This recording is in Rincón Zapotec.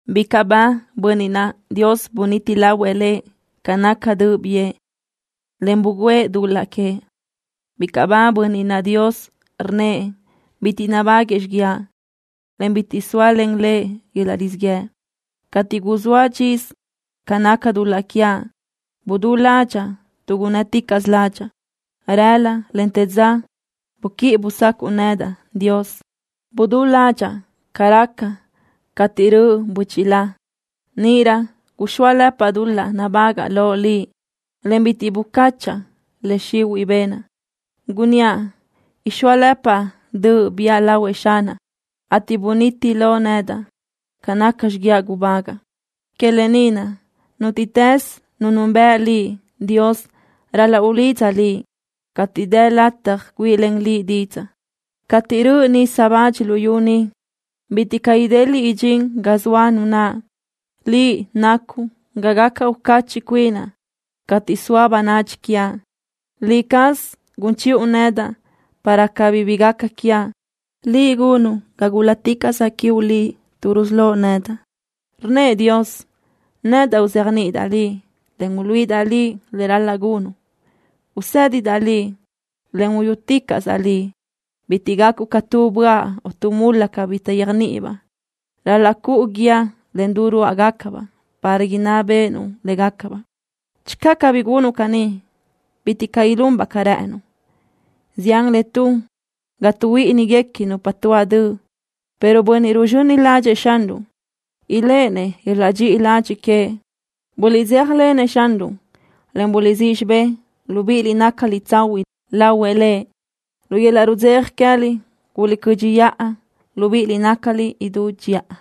¡Bicaʼ ba bönniʼ naʼ Dios buniti lahuëʼ lëʼ ca naca döʼ biʼë, en bugǘëʼ dul-laʼ queëʼ! ¡Bicaʼ ba bönniʼ naʼ Dios rnnëʼ bitiʼ nabáguëʼë xiguiaʼ, en bitiʼ zóalen lëʼ yöl-laʼ rizíʼ yëʼ! Cateʼ guzóaʼ dxisö ca naca dul-laʼ quiaʼ, budú ládxaʼa tuʼ gunnë́ticaʼsö ládxaʼa. Rëla, en te dza buquíʼi busácuʼu nedaʼ, Dios. Budú ládxaʼa ca raca cateʼ röʼ bö́chila. Níʼirö guxóalëpaʼ dul-laʼ nabágaʼa loʼ Liʼ, en bitiʼ bucáchaʼa le xihuiʼ benaʼ. Gunníaʼ: “Ixóalëpaʼ döʼ biʼa lahuëʼ Xanaʼ”, ateʼ buniti loʼ nedaʼ ca naca xiguiaʼ gubágaʼa. Que lë ni naʼ, nútiʼtës nu nunbëʼ Liʼ, Dios, ral-laʼ ulidza Liʼ cateʼ dë lataj güíʼilen Liʼ didzaʼ. Cateʼ röʼ nisa bach luyú ni, bitiʼ caʼ ideliʼ idxín ga zoa nu naʼ. Liʼ nacuʼ ga gaca ucachiʼ cuinaʼ cateʼ zoa bönadxi quiaʼ. Liʼ caz gun chiʼu nedaʼ para cabí bi gaca quiaʼ. Liʼ gunuʼ ga gúl-laticaʼsaʼ quiuʼ Liʼ tuʼ rusölóʼ nedaʼ. Rnnëʼ Dios: “Nedaʼ uzéajniʼidaʼ liʼ, en uluíʼidaʼ liʼ le ral-laʼ gunuʼ. Usédidaʼ liʼ, en uyúticaʼsaʼ liʼ. Bitiʼ gacuʼ ca tu böaʼ o tu mula cabí taʼyéajniʼibaʼ. Ral-laʼ cuʼu guíë en du rúʼugacabaʼ para inná béʼenuʼ légacabaʼ.” Channö cabí gunuʼ caní, bitiʼ caʼ ilunbaʼ ca rë́ʼënuʼ. Zián le tun ga tuʼhuíʼiniguequi nupa tuáʼ döʼ, pero bönniʼ ruzxöni ládxëʼë Xanruʼ iléʼenëʼ yöl-laʼ dxiʼi ladxiʼ queëʼ. Buliʼdzéjalenëʼ Xanruʼ, en buliʼsíʼ xibë́ʼ, libíʼiliʼ nácaliʼ tsahuiʼ lahuëʼ Lëʼ. Lu yöl-laʼ rudzeja queë́liʼ guliʼcö́dxiʼa, libíʼiliʼ nácaliʼ idú dxiʼa.